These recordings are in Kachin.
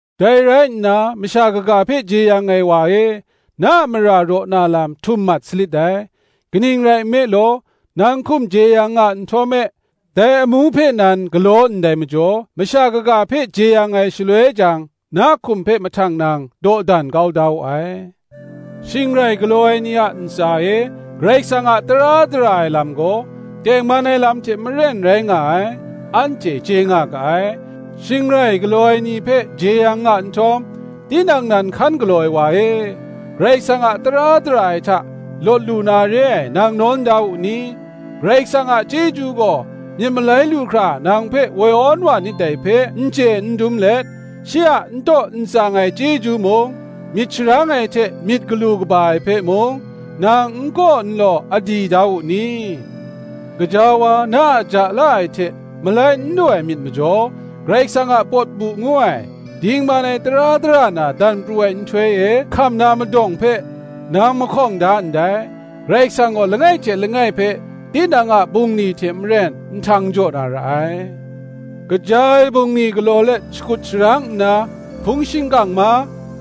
Dai rai nna, masha kaga hpe jeyang ai wa e, na a mara raw na lam htum mat salit dai; kaning rai nme law, nang hkum jeyang nga nhtawm me dai amu hpe nan galaw ndai majaw, masha kaga hpe jeyang ai shaloi jang, na hkum hpe mahtang nang dawdan kau da wu ai. Shing rai galaw ai ni a ntsa e Karai Kasang a tara dara ai lam gaw, tengman ai lam hte maren rai nga ai, anhte chye nga ga ai. Shing rai galaw ai ni hpe jeyang nga nhtawm, tinang nan hkan galaw ai wa e, Karai kasang a tara dara ai hta, lawt lu na re ai, nang nawn da wu ni? Karai Kasang a chyeju gaw myit malai lu hkra nang hpe woi awn wa nit dai hpe n chye n dum let, shi a n taw n tsang ai chyeju mung, myit sharang ai hte myit galu kaba ai hpe mung, nang n kaw n law a di da wu ni? Gaja wa, na a ja la ai hte malai n lu ai myit majaw, Karai Kasang a pawt bu ngu ai, dingman ai tara dara na dan pru ai nhtoi e hkam na madawng hpe, nang mahkawng da ndai. Karai Kasang gaw langai hte langai hpe, tinang a bungli hte maren nhtang jaw na ra ai: kaja ai bungli galaw let, shakut sharang nna hpung shingkang ma,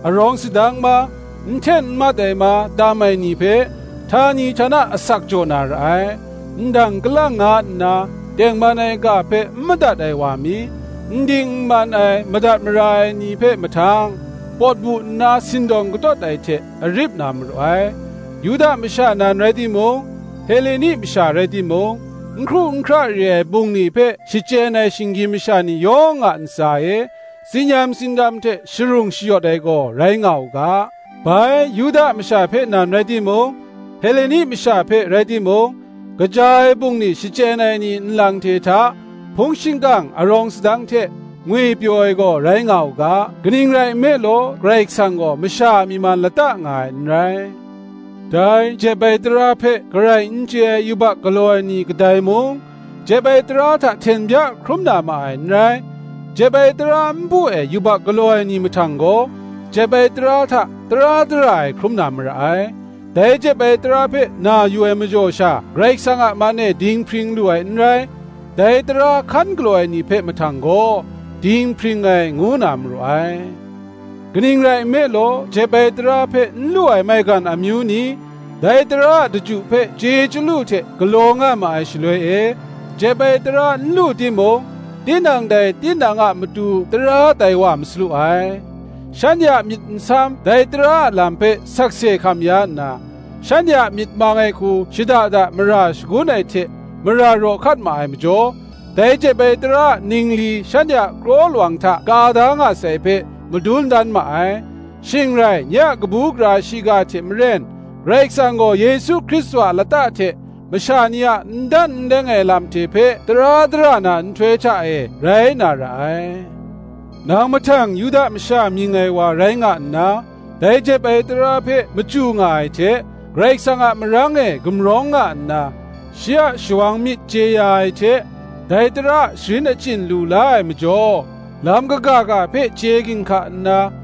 arawng sadang ma, n hten n mat ai ma, tam ai ni hpe, htani htana asak jaw na ra ai; ndang kalang nga nna tengman ai ga hpe n madat ai wa mi, n ding n man ai madat mara ai ni hpe mahtang, pawt bu nna sindawng katawt ai hte arip na maru ai; Yuda masha nan rai timung, Heleni masha rai timung, n hkru n hkra re ai bungli hpe shachyen ai shinggyim masha ni yawng a ntsa e, tsin-yam tsindam hte sharung shayawt ai gaw, rai nga u ga; bai, Yuda masha hpe nan rai timung, Heleni masha hpe rai timung, kaja ai bungli shachyen ai ni nlang hte hta hpung shingkang, arawng sadang hte ngwipyaw ai gaw, rai nga u ga: kaning rai nme law, Karai Kasang gaw masha a myi man lata nga ai n rai. Dai jep ai tara hpe garai n chye ai yubak galaw ai ni kadai mung, jep ai tara hta hten bya n hkrum na ma ai n rai; jep ai tara npu e yubak galaw ai ni mahtang gaw, jep ai tara hta tara dara ai hkrum na mara ai: dai jep ai tara hpe na yu ai majaw sha Karai Kasang a man e dinghpring lu ai n rai; dai tara hkan galaw ai ni hpe mahtang gaw, dinghpring ai ngu na maru ai. Kaning rai nme law, jep ai tara hpe n lu ai maigan amyu ni, dai tara a daju hpe chye chyalu hte galaw nga ma ai shaloi e, jep ai tara n lu timung, tinang dai tinang a matu tara tai wa masalu ai: shanhte a myit nsam dai tara a lam hpe sakse hkam ya nna, shanhte a myit mang ai hku shada da mara shagun ai hte mara raw hkat ma ai majaw, dai jep ai tara a ningli shanhte a kraw lawang hta ka da nga sai hpe, madun dan ma ai: shing rai, nye a kabu gara shiga hte maren, Karai Kasang gaw Yesu Hkristu a lata hte, masha ni a n dan n leng ai lam hte hpe tara dara na nhtoi hta e rai na ra ai. Nang mahtang Yuda masha mying ai wa rai nga nna, dai jep ai tara hpe machyu nga ai hte, Karai Kasang a marang e gumrawng nga nna, shi a shawang myit chye ya ai hte, dai tara a sharin achyin lu la ai majaw, lam kaga ga hpe chye ginhka nna,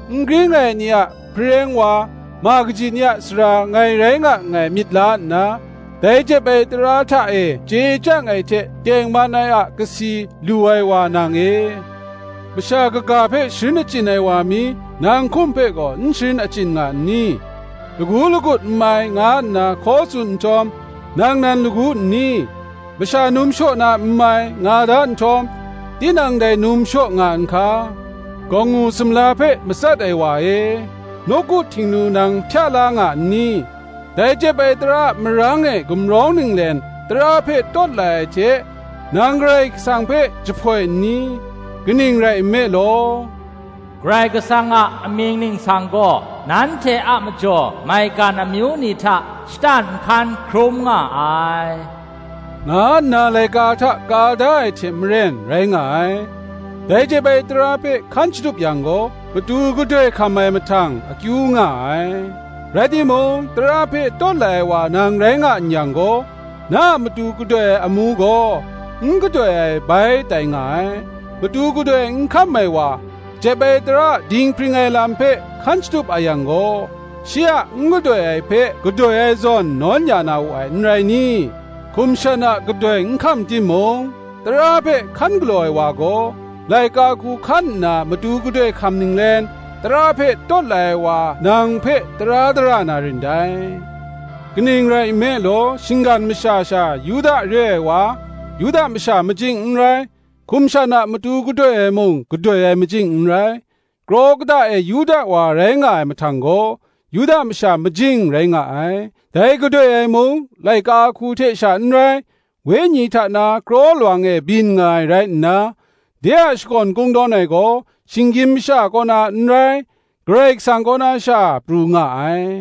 n gring ai ni a hpareng wa, ma kaji ni a sara ngai rai nga nngai myit la nna, dai jep ai tara hta e chye chyang ai hte tengman ai a kasi lu ai wa nang e, masha kaga hpe sharin achyin ai wa mi, nang hkum hpe gaw n sharin achyin nga n ni? lagu lagut n mai, nga nna hkaw tsun nhtawm, nang nan lagu n ni? masha num shaw na n mai, nga da nhtawm, tinang dai num shaw nga n hka? gawngngu sumla hpe matsat ai wa e, nawku htingnu nang hpya la nga n ni? dai jep ai tara a marang e gumrawng ninglen, tara hpe tawt lai ai hte, nang Karai Kasang hpe jahpoi n ni? Kaning rai nme law, Karai Kasang a amying ningsang gaw, nanhte a majaw maigan amyu ni hta shatan nhkan hkrum nga ai, nga nna laika hta ka da ai hte maren rai nga ai. Dai jep ai tara hpe hkan shatup yang gaw, matu gadoi hkam ai mahtang akyu nga ai; rai timung, tara hpe tawt lai ai wa nang rai nga n yang gaw, na a matu gadoi ai amu gaw, n gadoi ai bai tai nga ai. Matu gadoi n hkam ai wa, jep ai tara a dinghpring ai lam hpe hkan shatup a yang gaw, shi a n gadoi ai hpe gadoi ai zawn nawn ya na wu ai n rai ni? Hkum shan a gadoi n hkam timung, tara hpe hkan galaw ai wa gaw, laika hku hkan nna matu gadoi hkam ninglen, tara hpe tawt lai ai wa nang hpe, tara dara na rin dai. Kaning rai nme law, shinggan maga sha Yuda re ai wa, Yuda masha majing n rai; hkum shan a matu gadoi ai mung gadoi ai majing n rai; kraw kata e Yuda wa rai nga ai mahtang gaw, Yuda masha majing rai nga ai: dai gadoi ai mung, laika hku hte sha n rai, wenyi hta na kraw lawang e byin nga ai rai nna, de a shakawn kungdawn ai gaw shinggyim masha kaw na n rai, Karai Kasang kaw na sha pru nga ai.